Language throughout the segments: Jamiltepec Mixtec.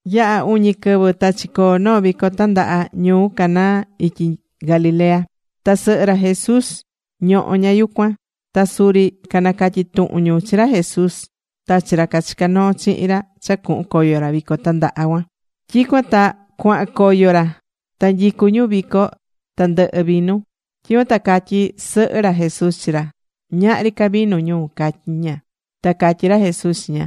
Yaha̱ uñi quɨvɨ ta chicoo̱ noo vico tandaha ñuu Caná ityi Galilea. Ta sɨhɨ ra Jesús ñohó ña yucuan. Ta suri canacatyi̱ tuhun ñu chi ra Jesús ta chi ra cachicá noo chihin ra cha cuhun coyo ra vico tandaha cuan. Tyicuan ta cuahan coyo ra. Ta nyicú ñu vico, ta ndɨhɨ̱ vinu. Tyicuan ta catyi̱ sɨhɨ ra Jesús chi ra: ―Ñahri ca vinu ñu ―catyí ña. Ta catyí ra Jesús chi ña: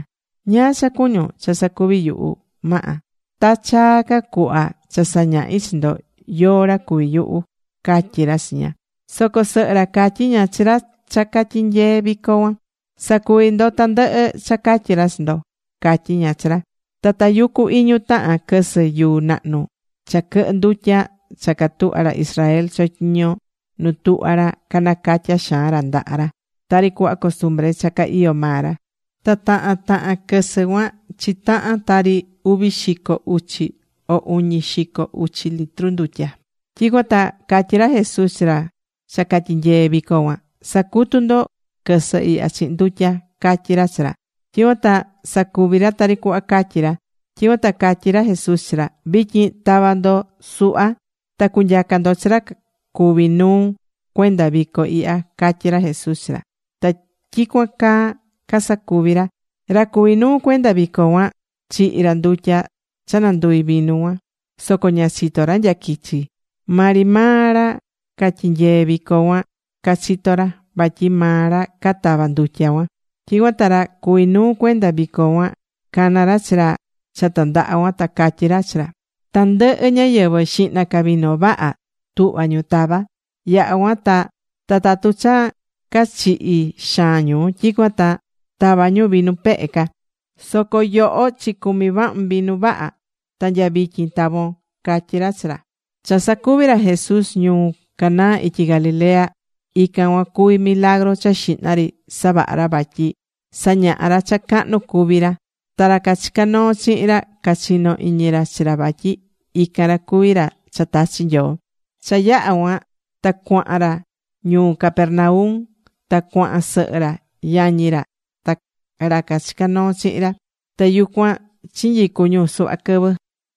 ―¿Ñáá cha cuñún cha sacuvi yuhu, Maha? Ta chaa ca cuhva cha sañahi chi ndo yóó ra cuví yuhu ―catyí ra chi ña. Soco sɨhɨ ra catyi̱ ña chi ra cha catyinyeé vico cuan: ―Sa̱cuvi ndo tandɨhɨ cha catyi ra chi ndo ―catyí ña chi ra. Ta tayucú iñu tahan quɨsɨ yuu nahnu cha quɨhɨ ndutya cha catuhvá ra Israel chotyiñó nu tuhvá ra canacatyá xaan ra ndaha ra tari cuhva costumbre cha ca iyó maa ra. Ta tahan tahan quɨsɨ cuan chitahan tari uvi xico uchi o uñi xico uchi litru ndutya. Tyicuan ta catyí ra Jesús chi ra cha catyinyeé vico cuan: ―Sa̱cutu ndo quɨsɨ ihya chihin ndutya ―catyí ra chi ra. Tyicuan ta sacuvi̱ ra tari cuhva catyi̱ ra. Tyicuan ta catyí ra Jesús chi ra: ―Vityin ta̱va ndo suhva ta cu̱nyaca ndo chi ra cuví nuu cuenda vico ihya ―catyí ra Jesús chi ra. Ta tyicuan caa casacuvi̱ ra. Ra cuví nuu cuenda vico cuan chihi̱ ra ndutya cha nanduvi̱ vinu cuan. Soco ña chitó ra nya quichi. Maa ri maa ra catyinyee vico cuan cachitó ra, vatyi maa ra catava̱ ndutya cuan. Tyicuan ta ra cuví nuu cuenda vico cuan cana̱ ra chi ra cha tandaha cuan. Ta catyí ra chi ra: ―Tandɨhɨ ñáyɨvɨ, xihna ca vinu vaha tuhvá ñu tava. Yaha cuan ta tatu cha cachihi̱ xaan ñu, tyicuan ta tava ñu vinu pehe ca. Soco yoho chicumi̱ vahun vinu vaha. Ta nya vityin tavo̱n ―catyí ra chi ra. Cha sacuvi̱ ra Jesús ñuu Caná ityi Galilea, ican cuan cuví milagru cha xihna ri savaha̱ ra vatyi sañaha̱ ra cha cahnu cuví ra. Ta ra cachicá noo chihin ra cachino̱ iñi ra chi ra vatyi ican ra cuví ra cha tachi̱ Nyoo. Cha yaha̱ cuan ta cuahan ra ñuu Capernaum. Ta cuahan sɨhɨ ra, yañi ra ta ra cachicá noo chihin ra. Ta yucuan chinyicu̱ ñu suhva quɨvɨ.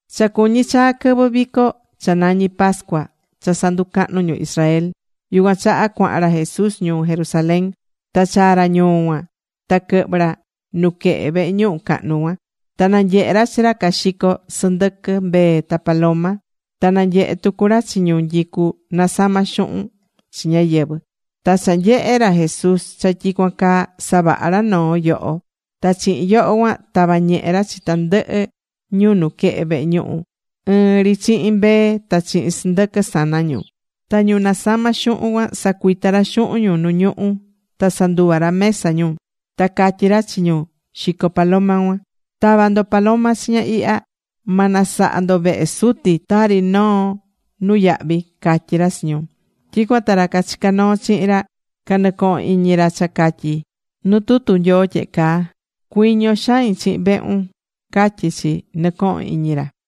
Cha cuñí chaa quɨvɨ vico cha nañí pascua cha sanducahnú ñu Israel. Yucuan chaha cuahan ra Jesús ñuu Jerusalén. Ta chaa̱ ra ñuu cuan, ta quɨhvɨ̱ ra nuquehe vehe ñuhu cahnu cuan, ta nanyehe̱ ra chi ra caxicó sɨndɨquɨ, mbee, ta paloma. Ta na nyehe̱ tucu ra chi ñu nyicú nasama xuhun chi ñáyɨvɨ. Ta cha nyehe̱ ra Jesús cha tyicuan caa, savaha̱ ra noo yoho. Ta chihin yoho cuan tava̱ ñehe ra chi tandɨhɨ ñu nuquehe vehe ñuhu ɨɨn ri chihin mbee ta chihin sɨndɨquɨ sana ñu. Ta ñu nasamá xuhun cuan, sacuita̱ ra xuhun ñu nu ñuhu ta sanduva̱ ra mesa ñu. Ta catyí ra chi ñu xicó paloma cuan: ―¡Ta̱va ndo paloma chiña ihya! ¡Ma nasaha ndo vehe Suti tari noo nuyahvi! ―catyí ra chi ñu. Tyicuan ta ra cachicá noo chihin ra, canɨcoho̱n iñi ra cha catyí nu tutu Nyoo tyehe caa: “Cuiño xain chihin vehun”, catyí chi, nɨcoho̱n iñi ra.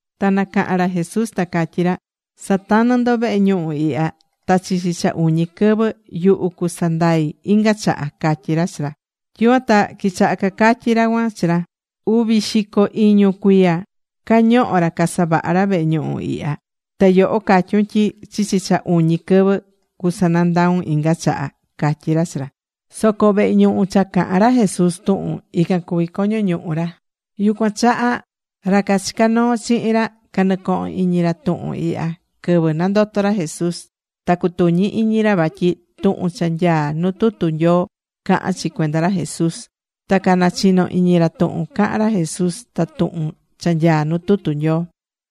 Ta nacaha̱n ra Jesús ta catyí ra: ―Sa̱tanɨ ndo vehe ñuhu ihya, ta chichi cha uñi quɨvɨ, yuhu cusanandai inga chaha ―catyí ra chi ra. Tyicuan ta quichaha cacatyí ra cuan chi ra: ―Uvi xico iñu cuiya cañoho̱ ra casavaha̱ ra vehe ñuhu ihya. Ta yoho catyún tyi chichi cha uñi quɨvɨ cusanandaun inga chaha ―catyí ra chi ra. Soco vehe ñuhu cha caha̱n ra Jesús tuhun, ican cuví coño ñuhu ra. Yucuan chaha ra cachicá noo chihin ra canɨcoho̱n iñi ra tuhun ihya quɨvɨ nandoto̱ ra Jesús. Ta cutuñi̱ iñi ra vatyi tuhun cha nyaá nuu tutu Nyoo cahán chi cuenda ra Jesús. Ta canachino̱ iñi ra tuhun caha̱n ra Jesús ta tuhun cha nyaá nu tutu Nyoo.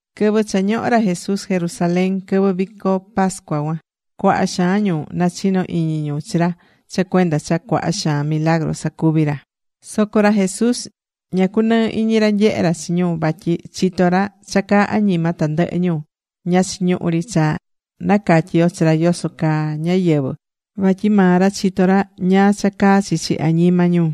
Quɨvɨ cha ñohó ra Jesús Jerusalén, quɨvɨ vico pascua cuan, cuaha xaan ñu nachino iñi ñu chi ra cha cuenda cha cuaha xaan milagru sacuvi̱ ra. Soco ra Jesús ña cunɨɨ iñi ra nyehé ra chi ñu vatyi chitó ra cha caá añima tandɨhɨ ñu. Ña chiñuhú ri cha nacatyi yo chi ra yoso caa ñáyɨvɨ, vatyi maa ra chitó ra ñáá cha caá chichi añima ñu.